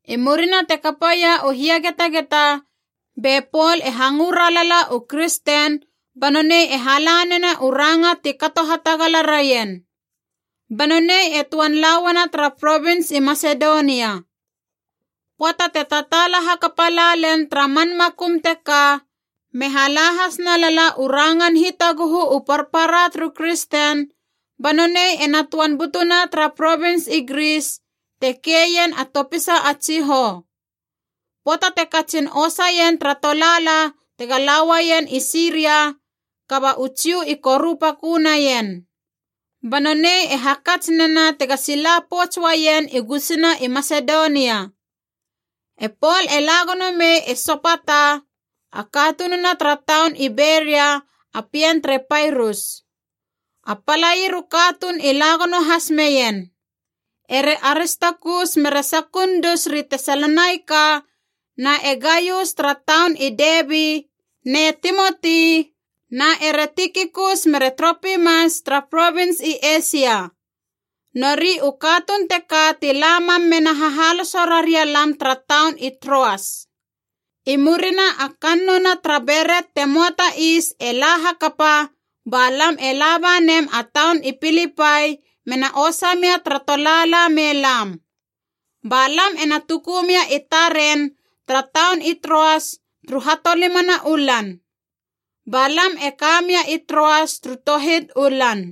I murina te kapaia u hiagetageta be Pol e hangö ralala u kristen ba nonei e hala nena u ranga ti kato hatagala raien. Ba nonei e töan la uana tara provins i Masedonia. Pöata te tataala hakapa la len tara man makum teka, me hala has nalala u rangan hitaguhu u parpara turu kristen, ba nonei ena töan butuna tara provins i Gris, te keien a topisa a tsihou. Pöata te katsin osa ien tara tolaala tega la uaien i Siria, kaba u Jiu i korupakö naien. Ba nonei e hakats nena tega sila pouts uaien i gusuna i Masedonia. E Pol e la gono mei e Sopata, a katununa tara taun i Beria a pien tere Pairus. A palair u katuun i la gono has meien: ere Aristakus mere Sekundus ri Tesalonaika, na e Gaius tara taun i Debi, ne Timoti, na ere Tikikus mere Tropimas tara provins i Eisia. Nori u katuun teka ti la mam mena hahaloso raria lam tara taun i Troas. I murina a kannouna tara Beret te möa ta Is e la hakapa, ba lam e laba nem a taun i Pilipai mena osa mia tara tolaala me lam. Ba lam ena tuku mia i taren tara taun i Troas turu hatolimana u lan. Ba lam e ka mia i Troas turu tohit u lan.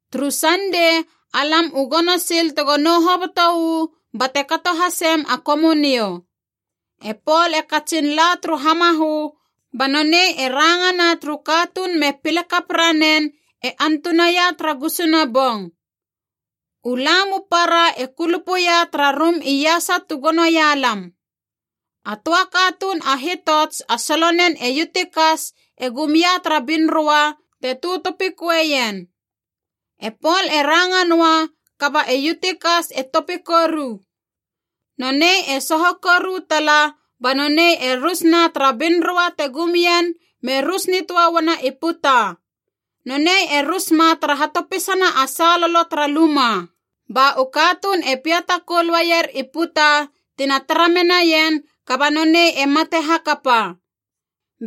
Turu Sandei alam u gono sil tego nou hoboto uu bate kato hasem a Komunio. E Pol e katsin la turu hamahö ba nonei e rangana turu katuun me pile kap ranen e antunaia tara gusuna bong. U lam u para e kulupuia tara rum iasa tu gonoia lam. A töa katuun a hitots a solonen e Yutikas e gum ia tara binroa te tötopikueien. E Pol e ranga noa kaba e Yutikas e topi koru. Nonei e soho koru tala ba nonei e rus na tara binroa te gum ien me rus nitöa uana i puta, nonei e rus ma tara hatopisana a salolo tara luma. Ba u katuun e piata koul uaier i puta tina tara menaien kaba nonei e mate hakapa.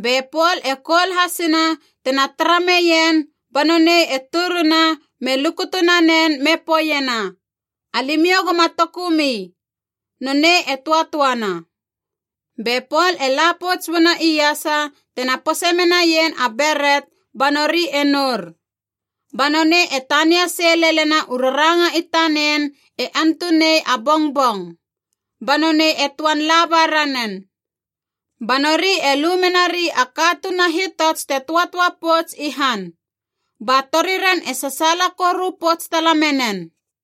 Be Pol e koul hasina tena tara meien ba nonei e turuna me lukutu nanen me poeiena, “Alimiou goma tokumi. Nonei e töatöana.” Be Pol e la pouts uana iasa tena pose menaien a beret ba nori e nour. Ba nonei e tania sei lelena u raranga i tanen e antunei a bongbong, ba nonei e töan laba ranen. Ba nori e lu menari a katuun a hitots te töatöa pouts i han. Ba toriren e sasaala koru pouts tala menen.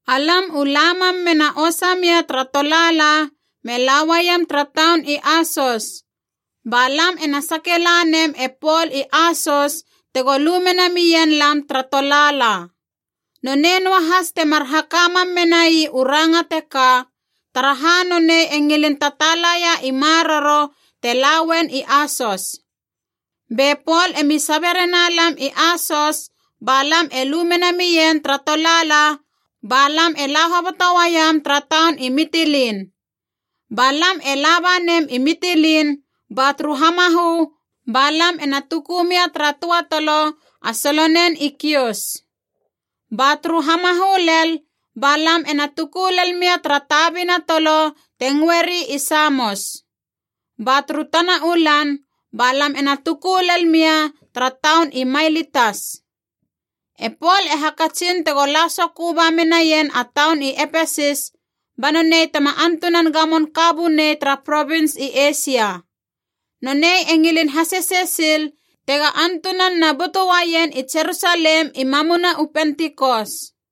Alam u la mam mena osa mia tara tolaala me lauaiem tara taun i Asos. Ba lam ena sake la nem e Pol i Asos tego lu mena mien lam tara tolaala. Nonei noahas temar haka mam menai u ranga teka, taraha nonei e ngilin tataalaia i maroro te lauen i Asos. Be Pol emi sabe rena lam i Asos, ba lam e lu mena mien tara tolaala ba lam e la hoboto uaiem tara taun i Mitilin. Ba lam e laba nem i Mitilin ba turu hamahö ba lam ena tuku mia tara töa tolo a solonen i Kios. Ba turu hamahö lel ba lam ena tuku lel mia tara tabina tolo te ngöeri i Samos. Ba turu tana u lan ba lam ena tuku lel mia tara taun i Mailitas. E Pol e hakatsin tego la sokö ba menaien a taun i Epesis ba nonei tema antunan gamon ka bunei tara provins i Eisia. Nonei e ngilin hasesei sil tega antunan na butu uaien i Jerusalem i mamuna u Pentikos.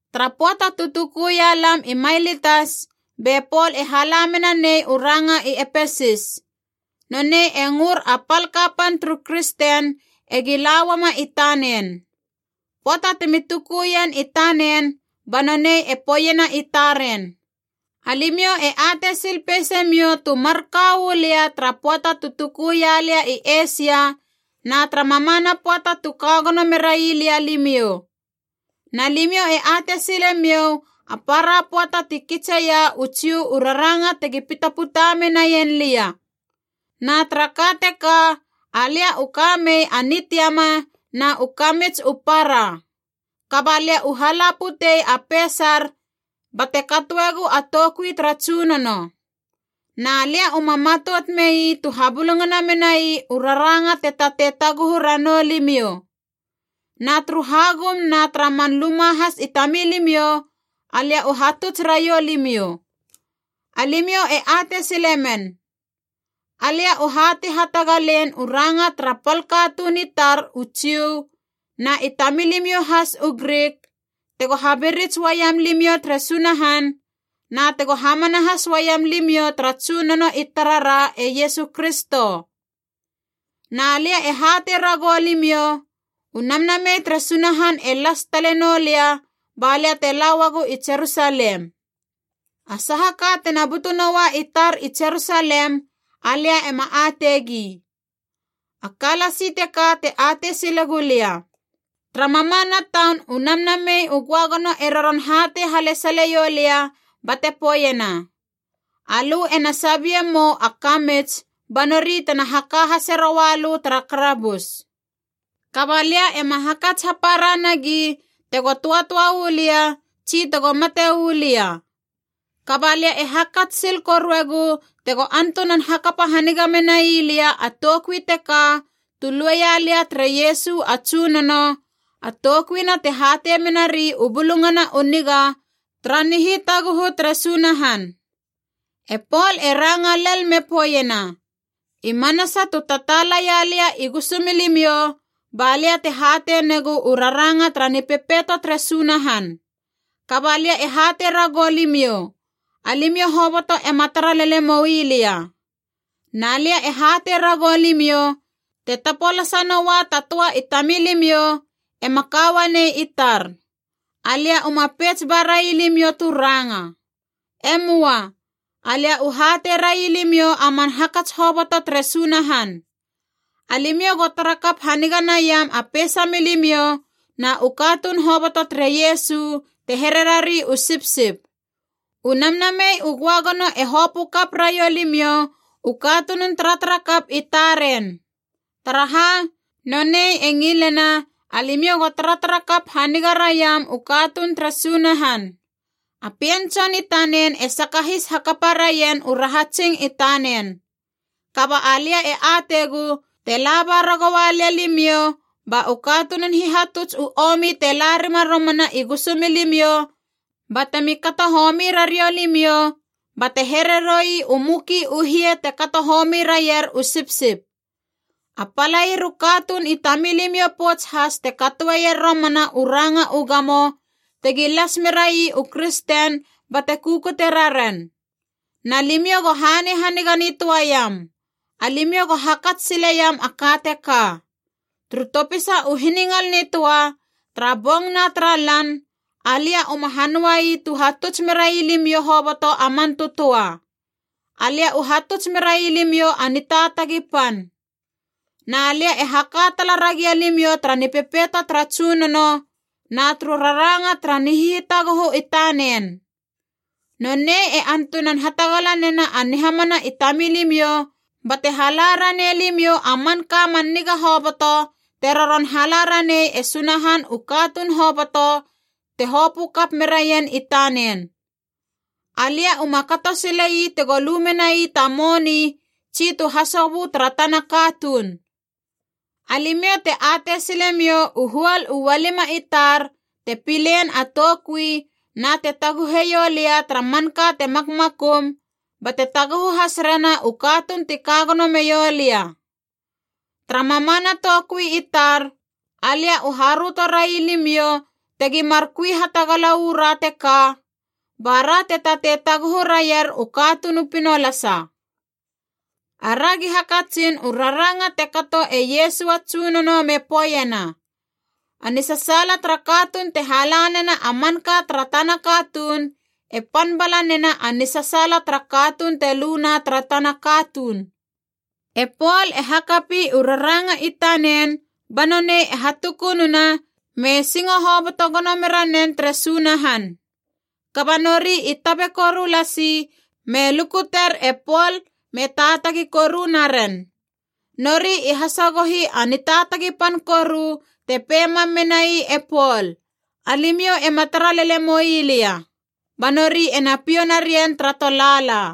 Tara pöata tu tukuia lam i Mailitas, be Pol e hala mena nei u ranga i Epesis. Nonei e ngör a pal kapan turu kristen egi la uama i tanen. Pöata temi tukuien i tanen ba nonei e poeiena i taren, “Alimiou e atei sil peisemiou tu marka uu lia tara pöata tu tuku ialia i Eisia, na tara mamana pöata tu ka gono merai lia limiou. Na limiou e atei sile miou, a para pöata ti kitseia u Jiu u raranga tegi pitaputa menaien lia. Na tara ka teka alia u ka mei a nitiama na u kamits u para. Kaba lia u hala putei a peisar bate katoegu a toukui tara Tsunono. Na lia uma matout mei tu habulungana menai u raranga te tatei taguhu ranou limiou. Na turu hagum na tara man luma has i tamilimiou, alia u hatuts raiou limiou. Alimiou e atei sile men. Alia u hatei hatagalein u ranga tara pal katuun i tar u Jiu na i tamilimiou has u Grik, tego habirits uaiam limiou tere Sunahan, na tego hamana has uaiam limiou tara Tsunono i tarara e Iesu Kristo. “Na lia e hatei ragou limiou, u Namnamei tere Sunahan e las tale noulia balia te la uagu i Jerusalem. A saha ka tena butu noua i tar i Jerusalem, alia ema ateigi. A ka lasi teka te atei sile gulia: tara mamana taun u Namnamei u Göagono e roron hatei halesaleiou lia bate poeiena, ‘Alö ena sabie mou a kamits ba nori tena haka hase roua lö tara karabus.’ Kaba lia ema hakats hapara nagi tego töatöa uu lia tsi tego mate uu lia. Kaba lia e hakats sil koruegu tego antunan hakapa haniga menai lia a toukui teka tu lueia lia tere Iesu a Tsunono, a toukuina te hatei menari u Bulungana u Niga tara nihitaguhu tere Sunahan.” E Pol e ranga lel me poeiena, “I manasa tu tataala ia lia i gusumilimiou, ba lia te hatei negu u rangana tara Nipepeito tere Sunahan. Kaba lia e hatei ragou limiou, alimiou hoboto ema tara lele moui lia. Na lia e hatei ragou limiou, te tapolasa noa ta töa i tamilimiou, ema ka uanei i tar. Alia uma peits ba railimiou tu ranga. E möa. Alia u hatei railimiou a man hakats hoboto tere Sunahan. Alimiou go tara kap haniga naiam a peisa milimiou na u katuun hoboto tere Iesu, te here rari u sipsip. U Namnamei u Göagono e hopö kap raiou limiou u katunun taratarakap i taren. Taraha, nonei e ngilena alimiou go taratara kap haniga raiam u katuun tere Sunahan. A Pien Tson i tanen e sakahis hakapa raien u rahatsing i tanen. Kaba alia e ateigu, te laba ragoua lia limiou ba u katunun hihatuts u omi te la rima romana i gusumilimiou batemi kato homi rariou limiou, bate here roi u muki u hie te kato homi raier u sipsip. A palair u katuun i tamilimiou pouts has te katoeier romana u ranga u gamo, tegi las merai u kristen bate kukute raren. Na limiou go hanei haniga nitöa iam. Alimiou go hakats sileiam a ka teka: turu topisa u hiningal nitöa, tara bong na tara lan, alia uma hanöa ii tu hatuts merai limiou hoboto a man tötöa. Alia u hatuts merai limiou a nitaatagi pan. “Na lia e haka tala ragia limiou tara nipepeito tara Tsunono, na turu rangana tara nihitaguhu i tanen. Nonei e antunan hatagala nena a nihamana i tamilimiou bate hala ranei limiou a manka man niga hoboto, te roron hala ranei e Sunahan u katuun hoboto te hopö kap meraien i tanen. Alia uma kato sile ii tego lu menai ta moni tsi tu hasobö tara tana katuun. Alimiou te atei silemiou u huol u ualima i tar te pilein a toukui na te taguheiou lia tara manka te makmakum, bate taguhu has rena u katuun ti ka gono meiou lia. Tara mamana toukui i tar, alia u haröto railimiou tegi mar kui hatagala uu ra teka, bara te tatei taguhu raier u katuun u pinolasa. Aragi hakatsin u raranga te kato e Iesu a Tsunono me poeiena, ‘A nisasaala tara katuun te hala nena a manka tara tana katuun e pan bala nena a nisasaala tara katuun te luna tara tana katuun.’” E Pol e hakapi u raranga i tanen ba nonei e hatukununa me singo hoboto gono mera nen tere Sunahan. Kaba nori i tabe koru lasi me lukuter e Pol me taatagi koru naren. Nori i hasagohi a nitaatagi pan koru te pei mam menai e Pol, “Alimiou ema tara lele moui lia.” Ba nori ena piou narien tara tolaala.